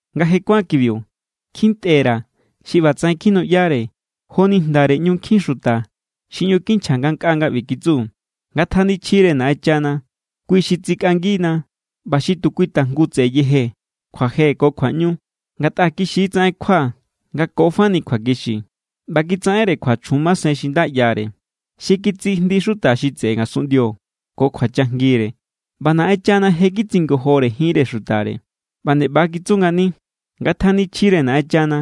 Nga je kuán kibiu, kjintꞌe_ra̱ xi ꞌbatsaꞌen kjinuꞌyare joni jndare ꞌñu nkjin xuta xi ꞌñu kinchja ngankꞌaa nga ꞌbi kitsu: “¡Ngatjanichjire Naꞌenchana! Kui= xi tsikꞌangina ꞌba xi tu kui tajngu tse̱ꞌe̱ yeje kjuaje ko kjuaꞌñu. Ngatꞌa kixi= tsaꞌen kjua nga ko fani kjuakixi, ꞌba kitsaꞌenre kjua chjun masen xi nda ꞌyare, xi kitsijndi xuta xi tseꞌe ngasunꞌndio ko kjuachajngire. ꞌBa Naꞌenchana je= kitsingojore jinre xutare.” ꞌBa nde ꞌba= kitsu ngani: “¡Ngatjanichjire Naꞌenchana!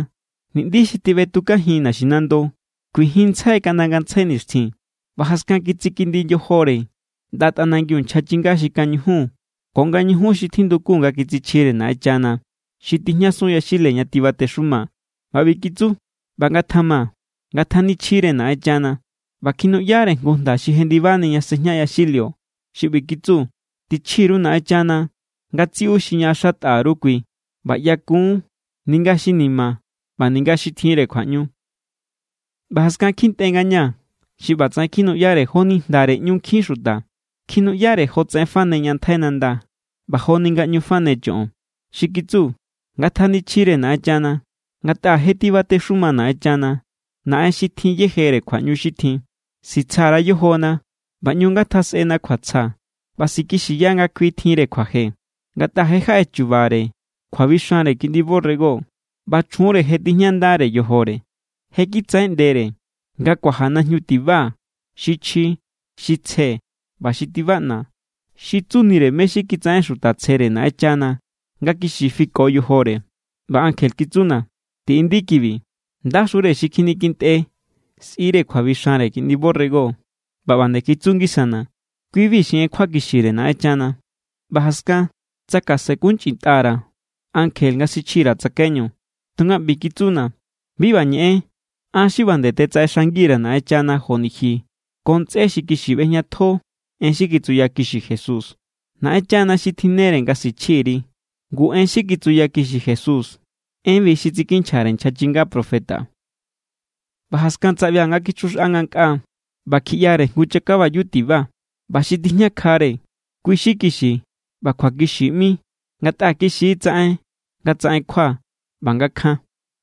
Ni̱ꞌndi xi tiꞌbetukajin naxinando, kuijinntsjai kaꞌnda ngantsjai nixtjin.” ꞌBa jaskan kitsikindi yojore ꞌnda tꞌanangiu nchja chinga xi kañujun ko nga ñujun xi tjindukun nga kitsichjire Naꞌenchana xi tijñasun yaxile ña tibatexuma. ꞌBa ꞌbi kitsu: “¡ꞌBa ngatjama! ¡Ngatjanichjire Naꞌenchana!” ꞌBa kjinuꞌyare jngu jnda xi jendibani ña sejña yaxilio xi ꞌbi kitsu: “Tichji_ru Naꞌenchana ngatsiꞌu xi ñaꞌaxatꞌa_ru kui ꞌba ꞌyakun, ninga xi ni̱ma̱ ꞌba ninga xi tjinre kjuaꞌñu.” ꞌBa jaskan kjintꞌe ngañaa̱ xi ꞌbatsaꞌen kjinuꞌyare joni jndare ꞌñu nkjin xuta. Kjinuꞌyare jotsaꞌen fane ña ntjai nanda ꞌba joni nga ꞌñu fane choꞌon. Xi kitsu: “¡Ngatjanichjire Naꞌenchana! Ngatꞌa je tibatexuma Naꞌenchana, Naꞌen xi tjin yejere kjuaꞌñu xi tjin. Sitsja_ra yojona ꞌba ꞌñu ngatjasꞌena kjuatsja ꞌba sikixiya nga kui tjinre kjuaje, ngatꞌa je jaꞌe chu̱ba̱re kjuabixanre Kiꞌndi borrego, ꞌba chjunre je tijñandare yojore. Je kitsaꞌeꞌndere nga kuaja najñu tiba xi chji, xi tsje, ꞌba xi tibaꞌna, xi tsunire mé= xi kitsaꞌen xuta tsjere Naꞌenchana nga kixi fiko yojore.” ꞌBa ankje kitsuna̱: “Tiꞌindi kibi: ¡Ndaxure xi kjinikjintꞌe sꞌire kjuabixanre Kiꞌndi borrego!” ꞌBa nde kitsu ngisana̱: “Kui=bi xi en kjuakixire Naꞌenchana.” ꞌBa jaskan tsakasenkunchꞌintꞌa_ra̱ ankje nga sichji_ra̱ tsakaiñu, tunga ꞌbi kitsuna̱: “Bi ꞌba ñeꞌen. An= xi ꞌba nde tetsaꞌexang_ra̱ Naꞌenchana joni ji ko ntsꞌé xi kixi ꞌbejñatjo en xi kitsuyakixi Jesús. Naꞌenchana xi tjinnere nga sichji_ri.” Ngu en xi kitsuyakixi Jesús, enbi xi tsikinchjare nchja chinga profeta. ꞌBa jaskan tsaꞌbia̱ nga kichjuxꞌa ngankꞌaa. ꞌBa kjiꞌyare jngu chakabayu tiba. ꞌBa xi tijñakjare, kui= xi Kixi ꞌba Kjuakixi ꞌmi ngatꞌa kixi= tsaꞌen nga tsaꞌen kjua ꞌba nga kjan.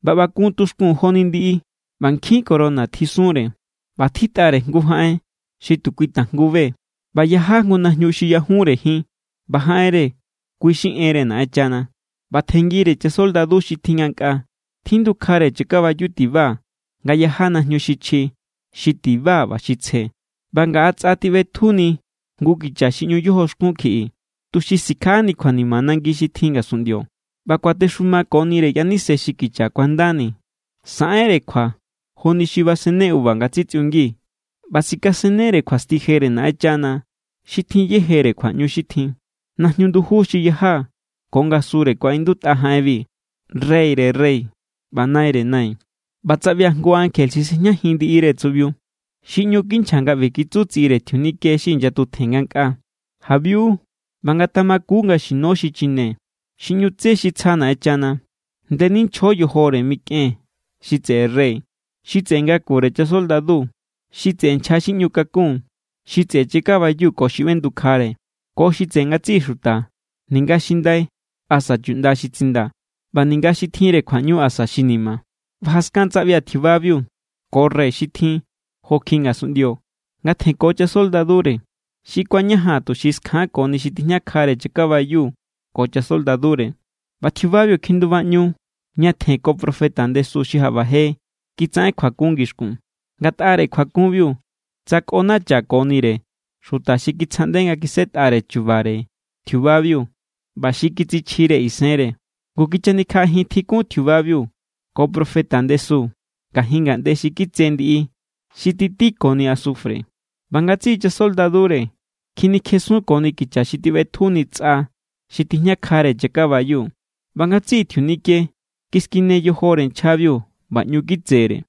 ꞌBa ꞌba kun tuxkun joni ndiꞌi, ꞌba nkjin corona tjisunre, ꞌba tjitꞌare jngu jaꞌen xi tu kui tajngu be. ꞌBa yaja jngu najñu xi ꞌyajunre jin. ꞌBa jaꞌenre, kui xi Enre Naꞌenchana. ꞌBa tjenngire chasoldadu xi tjin ngankꞌaa. Tjindukjare chakabayu tiba nga yaja najñu xi chji, xi tiba ꞌba xi tsje. ꞌBa ngaꞌa tsꞌa tiꞌbetjuni jngu kicha xi ꞌñu yojoxkun kjiꞌi, tuxi sikjaꞌani kjuanima nangi xi tjin ngasunꞌndio. ꞌBa kuatexumakonire yaníse xi kicha kuandani. Saꞌenre kjua joni xi basenne uva nga tsitsꞌiungi, ꞌba sikasennere kjuasti jere Naꞌenchana xi tjin yejere kjuaꞌñu xi tjin. Najñu nduju xi yaja ko ngasure kuaꞌindutꞌa jaꞌenbi: “Reyre rey ꞌba Naire nai.” ꞌBa tsaꞌbia̱ jngu ankje xi sejñajin ndiꞌire tsuꞌbiu. Xi ꞌñu kinchja nga ꞌbi kitsu tsiꞌire tjiunike xi inyatutjen ngankꞌaa: “Jabiu ꞌba ngatamaku nga xino xichine xi ꞌñu tse xi tsja Naꞌenchana. Ndeninchjo yojore mikꞌen xi tseꞌe rey, xi tseꞌe ngakure chasoldadu, xi tseꞌe nchja xi ꞌñu kakun, xi tseꞌe chakabayu ko xi ꞌbendukjare, ko xi tseꞌe ngatsiꞌi xuta, ninga xi ndai asa chuꞌnda xi tsindaa̱, ꞌba ninga xi tjinre kjuaꞌñu asa xi ni̱ma̱.” ꞌBa jaskan tsaꞌbia̱ tjiubabiu ko rey xi tjin jo kjiꞌi ngasunꞌndio nga tjenko chasoldadure. Xi kuañajan, tuxi skjankoni xi tijñakjare chakabayu ko chasoldadure. ꞌBa tjiubabiu kjindubaꞌñu ñatjen ko profeta ndesu xi jaꞌba je kitsaꞌen kjuakun ngixkun. Ngatꞌare kjuakunbiu tsakꞌonachakonire xuta xi kitsjaꞌnde nga kisꞌetꞌare chu̱ba̱re tjiubabiu ꞌba xi kitsichjire isenre. Ngu kichanikjaꞌajin tjikun tjiubabiu ko profeta ndesu ngajin ngaꞌnde xi kitse ndiꞌi xi titíkoni asufre. ꞌBa ngatsiꞌi chasoldadure kjinikjesunkoni kicha xi tiꞌbetjuni tsꞌa xi tijñakjare chakabayu. ꞌBa ngatsiꞌi tjiunike kiskine yojore nchjabiu ꞌba ꞌñu kitsere.